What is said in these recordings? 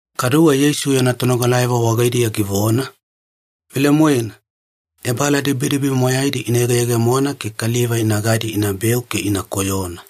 Kaduwe Yeisu yana tonogalayavo wagaidiya givona, “Velemoena, ebaaladibidibi moyaidi ina yegeyegemona ke kaliva inagadi inabeu ke ina koyona.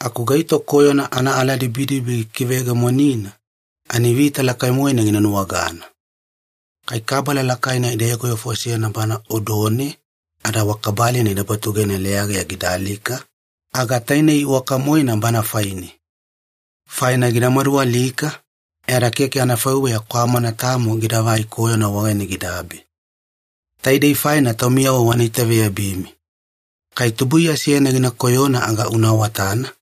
Aku gaito koyona anaaladibidibi gikiveyegemonina, ani vita lakai-moena gina nuwagana. Kai kabala lakaina ida yogovefosena bana odone ada wa kabalina ida batugena leyageya gida alika, aga tainei iwaka-moena bana faine. Faina gida madualika, e ada keke anafaiweya kwamana tamo gidagai koyona wagaine gidabe. Taidei faina taumiyavo wana itaveyabimi. Kai tubuiya seyana gina koyona aga una awatana,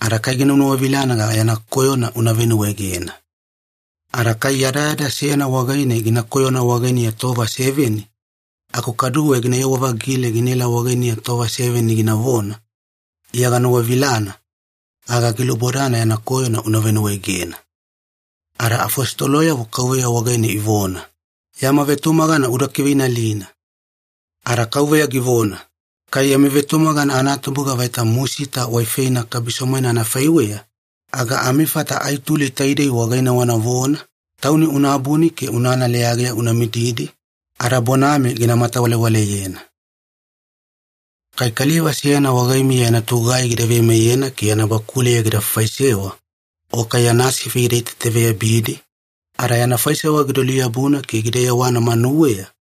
ada kai gina nuwavilana aga yana koyona una venuwaegena. Ada kai yadayada seyana wagaine gina koyona wagainiya tova seveni, aku kaduwe ginayewa-vagile ginaelai wagainiya tova seveni ginavona, ‘Iya ganuwavilana,’ aga gilubodana yana koyona una venuwaegena.” Ada afositoloyavo Kauveya wagaine ivona, “Yama vetumagana uda kiveinalina.” Ada Kauveya givona, “Kai yami vetumagana anatubuga vaita musita waifeina kabiso-moena anafaiweya, aga amifata ai tuli taidei wagaine wanavona, ‘Tauni una abuni ke unana leyageya una mididi,’ ada bonami gina matawalewaleyena. “Kai kaliva seyana wagaimiya yana togugai gida veimeyena ke yana bakuleya gida faifaisewa, o kai yana sifi gida itaitaveyabidi, ada yana faisewa gida luyabuna ke gida yewana manuweya,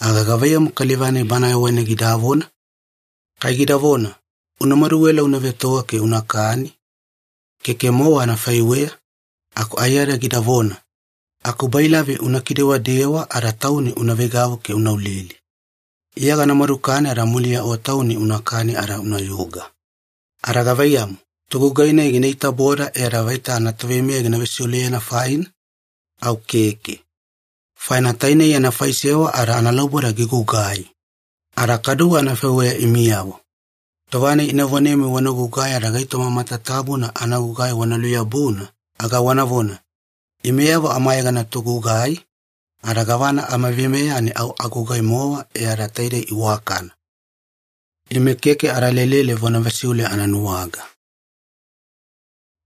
aga gavaiyamu kaliva-nai bana wagaine gidavona? Kai gidavona, ‘Una maduela una vetoga ke unakani?’ Keke-mowa anafaiweya, aku aiyada gidavona, ‘Akubailavi una kidewadewa ada tauni una veigavu ke una ulili. Iya gana madukani ada muliya o tauni unakani ada unayuga.’ Ada gavaiyamu, togugai-nai gina itaboda e ada vaita anatoveimeya gina vesiuleyena faina? Au keke. Faina tainei yana faisewa ada analauboda gigugai. Ada kaduwe anafaiweya imiyavo. Tova-nai ina vonemi wana gugai ada gaitoma matatabuna anagugai wana luyabuna, aga wanavona, ‘Imeyavo amayegana togugai, ada gavana amaveimeya ani au agugai-mowa e ada taidei iwakana. Ime keke ada lelele vona vesiule ananuwaga.’”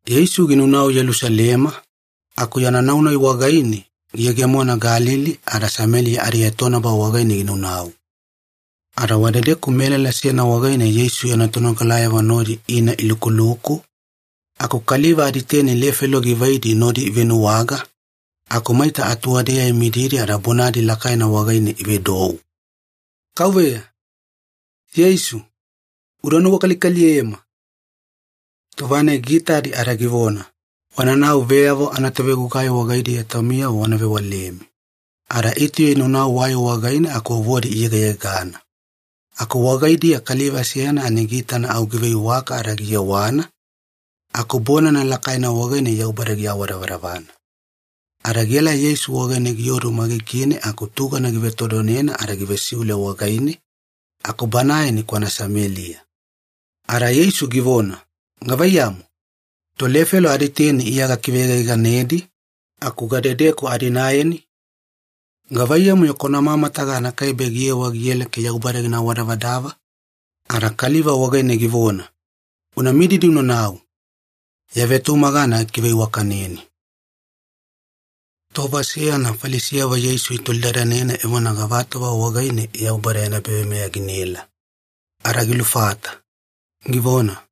Yeisu ginaunau Yelusalema, aku yana nau-nai wagaine giyegemona Galili ada Sameliya adietonaba wagaine ginaunau. Ada wadedeku melala seyana wagaine Yeisu yana tonogalayavo nodi ina ilukuluku, aku kaliva aditeni lefelo givaidi nodi ivenuwaga, aku maita atuwadeya imididi ada bonadi lakaina wagaine ivedou, “Kauveya! Yeisu! Uda nuwakalikaliyema!” Tova-nai giitadi ada givona, “Wananau veyavo anatovegugai wagaidiya taumiyavo wana vewalemi.” Ada itauya inaunau wai wagaine aku vovodi iyegayegana. Aku wagaidiya kaliva seyana ani giitana au giveiwaka ada giyewana, aku bonana lakaina wagaine Yaubada giawadavadavana. Ada gielai Yeisu wagaine giodu magigine aku tugana givetodonena ada givesiule wagaine, aku banae ani kwana Sameliya. Ada Yeisu givona, “Gavaiyamu? Tolefelo aditeni Iya gakiveyegayeganedi, aku gadedeku adinaeni? Gavaiyamu-yo kwana mamataga anakaibe giyewa giela ke Yaubada gina awadavadava?” Ada kaliva wagaine givona, “Una mididi unanau. Ya vetumagana gikiveiwakaneni.” Tova seyana Falisiyavo Yeisu itolidadanena evona gavatova wagaine Yaubada yana ebaveimeya ginaela, ada gilufata, givona,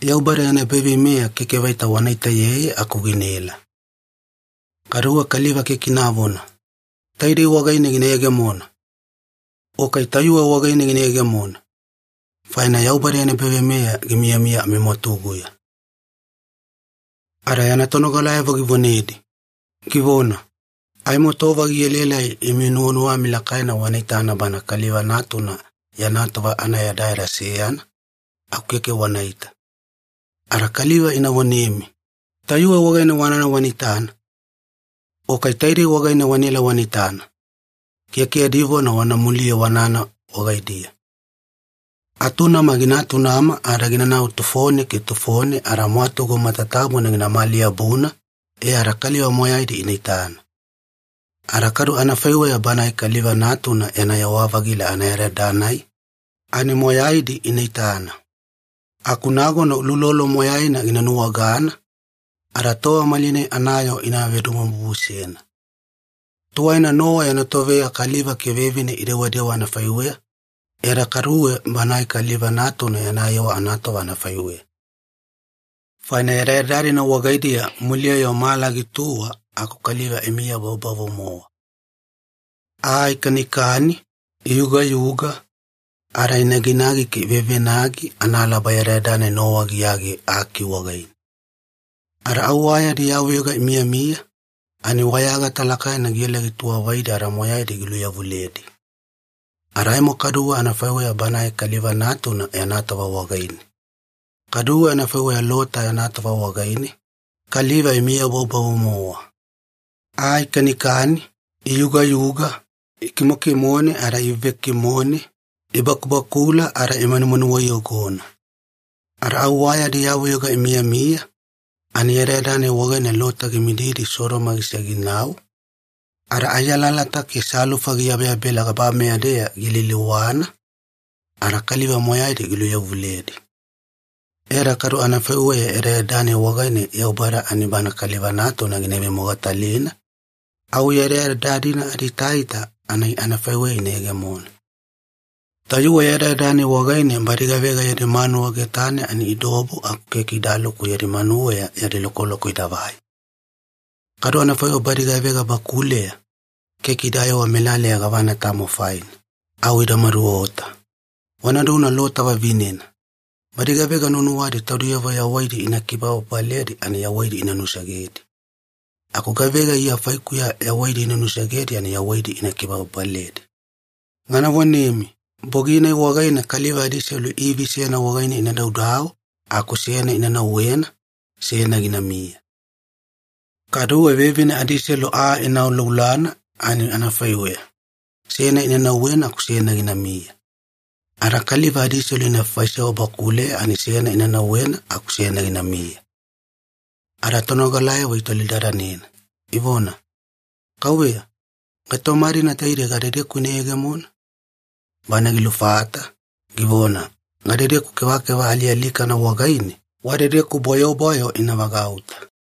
“Yaubada yana ebaveimeya keke vaita wana itaeyeye aku ginaela. Kaduwe kaliva keke inavona, ‘Taidei wagaine gina yegemona!’ o kai ‘Tayuwe wagaine gina yegemona!’ Faina Yaubada yana ebaveimeya gimiyamiya amimwatuguya.” Ada yana tonogalayavo givonedi, givona, “Aimo tova gielaelai imi nuwanuwami lakaina wana itana Bana Kaliva Natuna yana tova anayadayada seyana, aku keke wanaita. Ada kaliva ina vonemi, ‘Tayuwe wagaine wanana wana itana!’ o kai ‘Taidei wagaine wanaela wana itana!’ Keke yadi vona wana muliye wanana wagaidiya. Atunama gina atunama ada ginanau tufone ke tufone ada mwatugu matatabuna ginamali-yabuna, e ada kaliva moyaidi ina itana. Ada kadu anafaiweya Banae Kaliva Natuna yana yewa-vagila anayadayada-nai, ani moyaidi ina itana. Aku nagona uloulolo moyaina gina nuwagana, ada tova malinai anayoo ina vedomobubusena. Tuwaina Nowa yana toveya kaliva ke vevine idewadewa anafaiweya, e ada kaduwe Banae Kaliva Natuna yana yewa anatova anafaiweya. Faina yadayada-dina wagaidiya muliya-yo mala gituwa aku kaliva imiyabavubavu-mowa. Aa ikanikani, iyugayuga, ada inaginagi ke ivevenagi analaba yadayada-nai Nowa giyage aki wagaine. Ada au wa yadi yavuyoga imiyamiya, ani wayagata lakaina giela gituwavaidi ada moyaidi giluyavuledi. Ada aimo kaduwe anafaiweya Banae Kaliva Natuna yana tova wagaine. Kaduwe anafaiweya Lota yana tova wagaine, kaliva imiya bavubavu-mowa. Aa ikanikani, iyugayuga, ikimokimone ada ivevekimone, ibakubakula ada imanumanuwa iyogona. Ada au wa yadi yavuyoga imiyamiya, ani yadayada-nai wagaine Lota gimididi Sodoma gisege ginau, ada ai alalata ke salufa giyabeyabela gabameya-deya gialiliwana, ada kaliva moyaidi giluyavuledi. E ada kadu anafaiweya yadayada-nai wagaine Yaubada ani Bana Kaliva Natuna gina ivemogatalina, au yadayada-dina adiitaita ani anafaiweya ina yegemona. Tayuwe yadayada-nai wagaine badi gavega yadi manuwa getane ani idaobu aku keke idaluku yadi manuweya yadi lokoloko idavai. Kadu anafaiweya badi gavega bakuleya, keke idayewa melaleya gavana tamo faina. Au ida maduota. Wanaduna Lota vavinena! Badi gavega nuwanuwadi taudiyavo yawaidi ina kibababaledi ani yawaidi ina nusegedi. Aku gavega Iya faikuya yawaidi ina nusegedi ani yawaidi ina kibababaledi. Gana vonemi, bogi-nai wagaine kaliva adiselu ivi seyana wagaine ina daudau aku seyana ina nauwena, seyana ginamiya. Kaduwe vevine adiselu aa ina auaulana ani anafaiweya, seyana ina nauwena aku seyana ginamiya.” “Ada kaliva adiselu ina faifaisewa bakuleya ani seyana ina nauwena aku seyana ginamiya.” Ada tonogalayavo itolidadanena, ivona, “Kauveya, gaitoma-dina taidei gadedeku ina yegemona?” Bana gilufata, givona, “Gadedeku kevakeva alialikana wagaine, wadedeku bwayobwayo ina vagauta.”